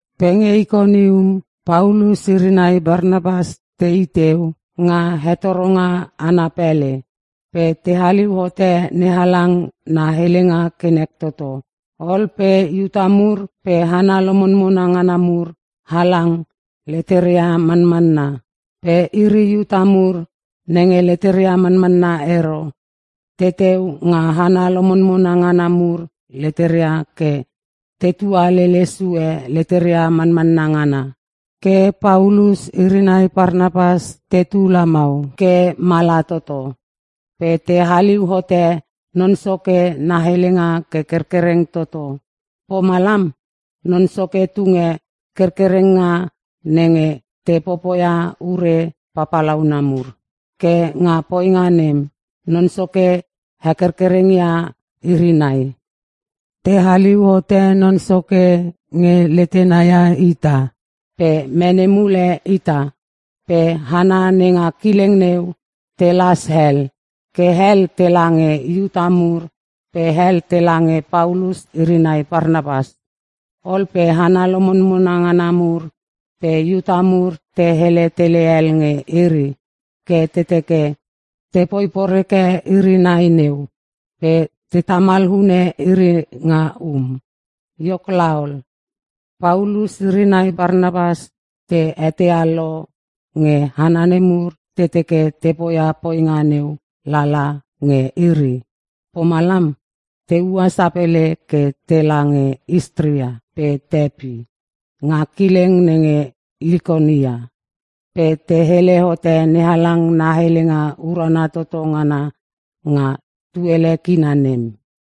Pe nge Ikonium, Paulus iri nai Parnapas tei teu nga hetoronga ana pele. Pe te haliu hote NeHalang na helenga ke nek toto. Ol pe Iuta mur pe hana lomonmona ngana mur halang leteria manmanna. Pe iri Iuta mur nenge leteria manmanna ero, teteu nga hana lomonmona ngana mur leteria ke tetua lele sue leteria manmanna ngana. Ke Paulus iri nai Parnapas tetu lamau ke mala toto, pe te haliu hote Non Soke na helenga ke kerkereng toto. Pomalam, Non Soke tunge kerkerenga nenge te popoia ure papalauna mur. Ke nga poinga nem, Non Soke hekerkereng ia iri nai. Te haliu hote Non Soke nge letena ia ita pe mene mule ita. Pe hana nenga kileng neu telas hel. Ke hel tela nge Iuta mur pe hel tela nge Paulus iri nai Parnapas. Ol pe hana lomonmona ngana mur pe Iuta mur te hele tele hel nge iri ke te teke tepoi poreke iri nai neu pe te tamal hune iri nga um. Iok laol, Paulus iri nai Parnapas te eteia lo nge hana nemur te teke te poia poinga neu lala nge iri. Pomalam, te ua sapele ke tela nge Listra pe Tepi nga kileng nenge Likaonia. Pe te hele hote NeHalang na helenga urana toto ngana nga tuele kina nem.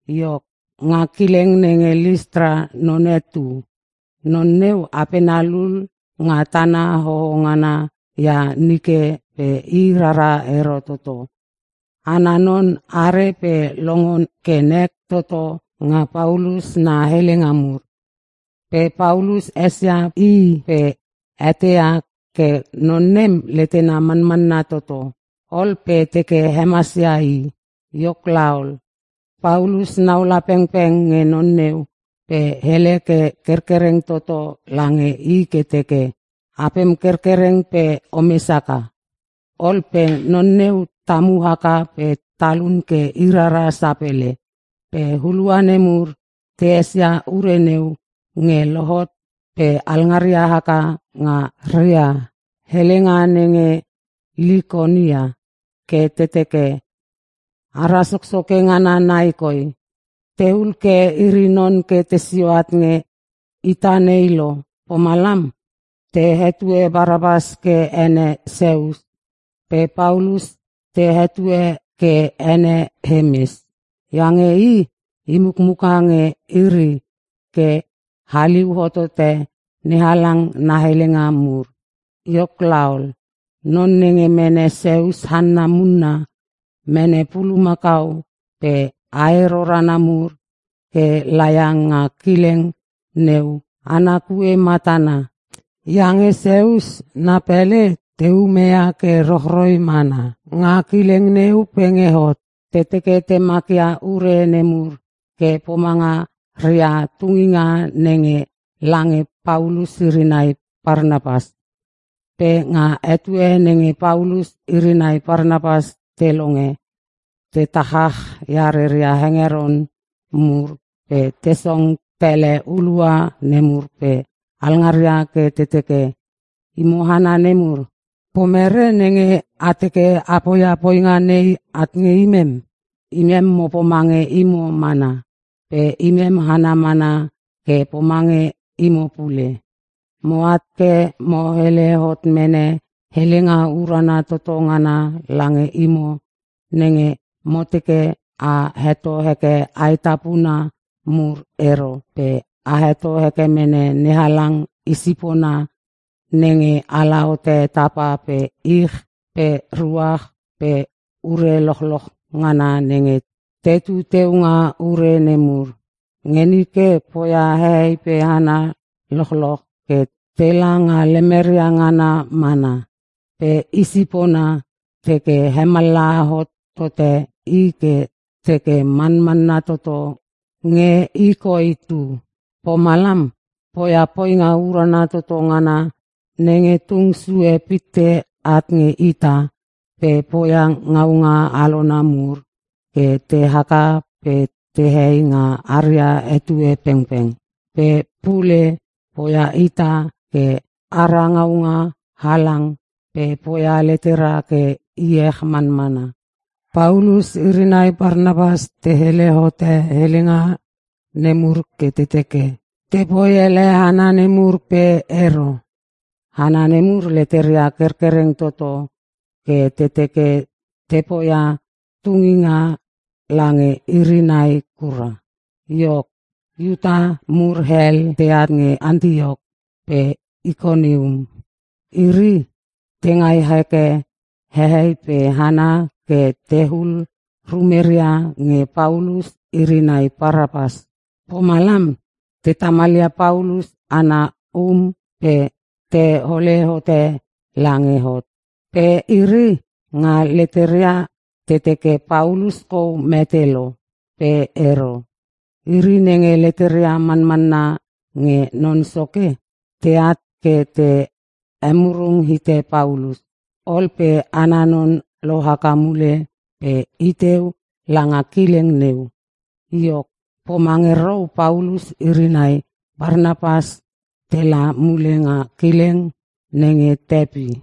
Iok, nga kileng nenge Listra, none tu. Non neu apena lul nga tana hoho ngana ia nike pe i rara ero toto. Ana non are pe longo ke nek toto nga Paulus na helenga mur. Pe Paulus esia i pe eteia ke non nem letena manmanna toto. Ol pe teke hemasia i. Iok laol, Paulus naula pengpeng nge non neu pe hele ke kerkereng toto lange i ke teke, “Apem kerkereng pe omes haka.” Ol pe non neu tamu haka pe talun ke irara sapele. Pe hulua nemur, te esia ure neu nge lohot pe alngaria haka nga ria helenga nenge Likaonia ke te teke, “Ara soksoke ngana nai koi! Te hul ke iri non ke tesio at nge ita nei lo!” Pomalam, te hetue Parnapas ke ene Seus pe Paulus te hetue ke ene Hemes. Iange i, i mukmuka nge iri ke haliu hotote NeHalang na helenga mur. Iok laol, non nenge mene Seus hanna munna, mene pulumakau pe ae rorana mur ke laia nga kileng neu ana kue matana. Iange Seus na pele, te umeia ke rochroi mana nga kileng neu pe nge hot. Te teke te makia ure nemur ke pomanga ria tunginga nenge lange Paulus iri nai Parnapas. Pe nga etue nenge Paulus iri nai Parnapas te longe, te tachach ia rea hengeron mur pe te song tele hulua nemur pe alngaria ke te teke, “Imo hana nemur, pomere nenge a teke a poia poinga nei at nge imem? Imem mo pomange imo mana. Pe imem hana mana ke pomange imo pule. Moat ke mo hele hot mene helenga urana toto ngana lange imo nenge mo teke a heto heke aetapuna mur ero pe a heto heke mene NeHalang i sipona nenge ala hote tapa pe ich pe ruach pe ure lochloch ngana nenge tetu teu nga ure nemur. Nge nike, poia hehei pe hana lochloch ke tela nga lemeria ngana mana. Pe i sipona teke hemallaha hot tote i ke teke manmanna toto nge i koi tu. Pomalam poia poinga urana toto ngana nenge tung sue pitte at nge ita pe poia ngaunga alona mur ke te haka pe tehei nga aria etue pengpeng. Pe pule poia ita ke ara ngaunga halang pe poia letera ke iech manmana.” Paulus iri nai Parnapas te hele hote helenga nemur ke te teke, tepoi ele hana nemur pe ero. Hana nemur leteria kerkereng toto ke te teke te poia tunginga lange iri nai kura. Iok, Iuta mur hel teat nge Antiok pe Ikonium. Iri, te ngai heke hehei pe hana ke tehul rumeria nge Paulus iri nai Parnapas. Pomalam, te tamalia Paulus ana um pe tehole hote lange hot. Pe iri, nga leteria te teke Paulus kou mete lo. Pe ero. Iri nenge leteria manmanna nge Non Soke, teat ke te emurung hite Paulus. Ol pe ana non lohaka mule pe iteu langa kileng neu. Iok, poma nge rou Paulus iri nai Parnapas tela mule nga kileng nenge Tepi.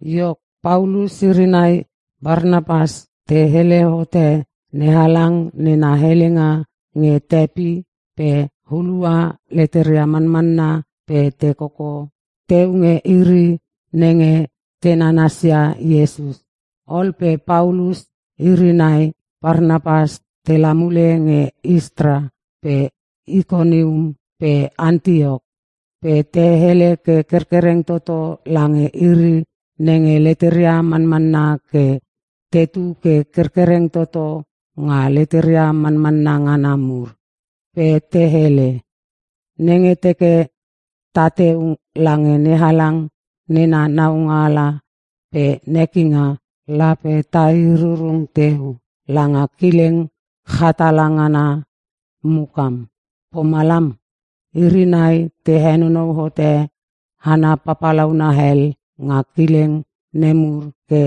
Iok, Paulus iri nai Parnapas te hele hote NeHalang nena helenga nge Tepi pe hulua leteria manmanna pe te koko teu nge iri nenge te nanasia Iesus. Ol pe Paulus iri nai Parnapas tela mule nge Listra pe Ikonium pe Antiok. Pe te hele ke kerkereng toto lange iri nenge leteria manmanna ke tetu ke kerkereng toto nga leteria manmanna ngana mur. Pe te hele, “Nenge teke tateu langa NeHalang nena naualanga pe nekinga, lape tai rurung teu langa kileng chatala ngana mukam.” Pomalam iri nai te henonou hote hana papalauna hel nga kileng nemur ke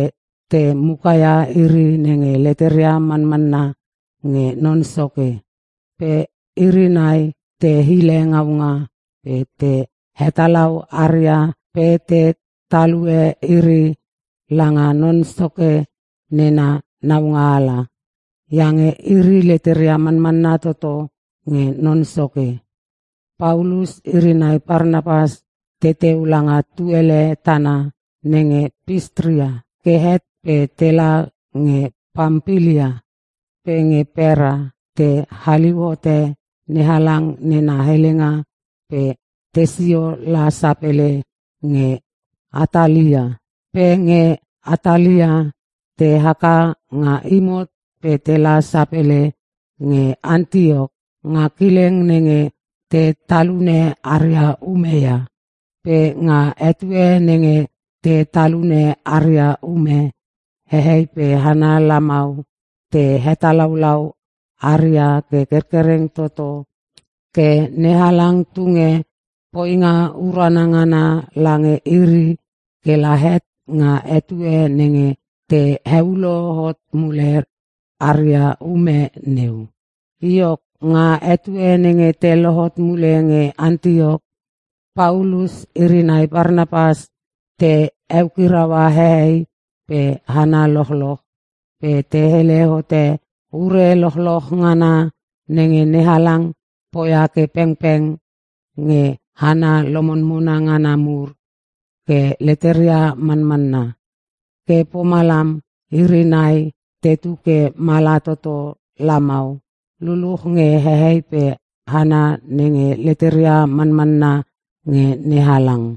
te mukaia iri nenge leteria manmanna nge Non Soke. Pe iri nai te hile ngaunga pe te hetalau aria pe te talue iri langa Non Soke nena naualanga. Iange iri leteria manmanna toto nge Non Soke. Paulus iri nai Parnapas teteu langa tuele tana nenge Pisitia ke het pe tela nge Pampilia. Pe nge Perka te haliu hote NeHalang nena helenga pe tesio la sapele nge Atalia. Pe nge Atalia, te haka nga imot pe tela sapele nge Antiok nga kileng nenge te talune aria ume ia. Pe nga etue nenge te talune aria ume, hehei pe hana lamau te hetalaulau aria ke kerkereng toto ke NeHalang tunge poinga urana ngana lange iri kela het nga etue nenge te heulo hot mule aria ume neu. Iok, nga etue nenge te lohot mule nge Antiok, Paulus iri nai Parnapas te eukiraua hehei pe hana lochloch pe te hele hote ure lochloch ngana nenge NeHalang poia ke pengpeng nge hana lomonmona ngana mur ke leteria manmanna. Ke pomalam, iri nai tetu ke mala toto lamau luluch nge hehei pe hana nenge leteria manmanna nge NeHalang.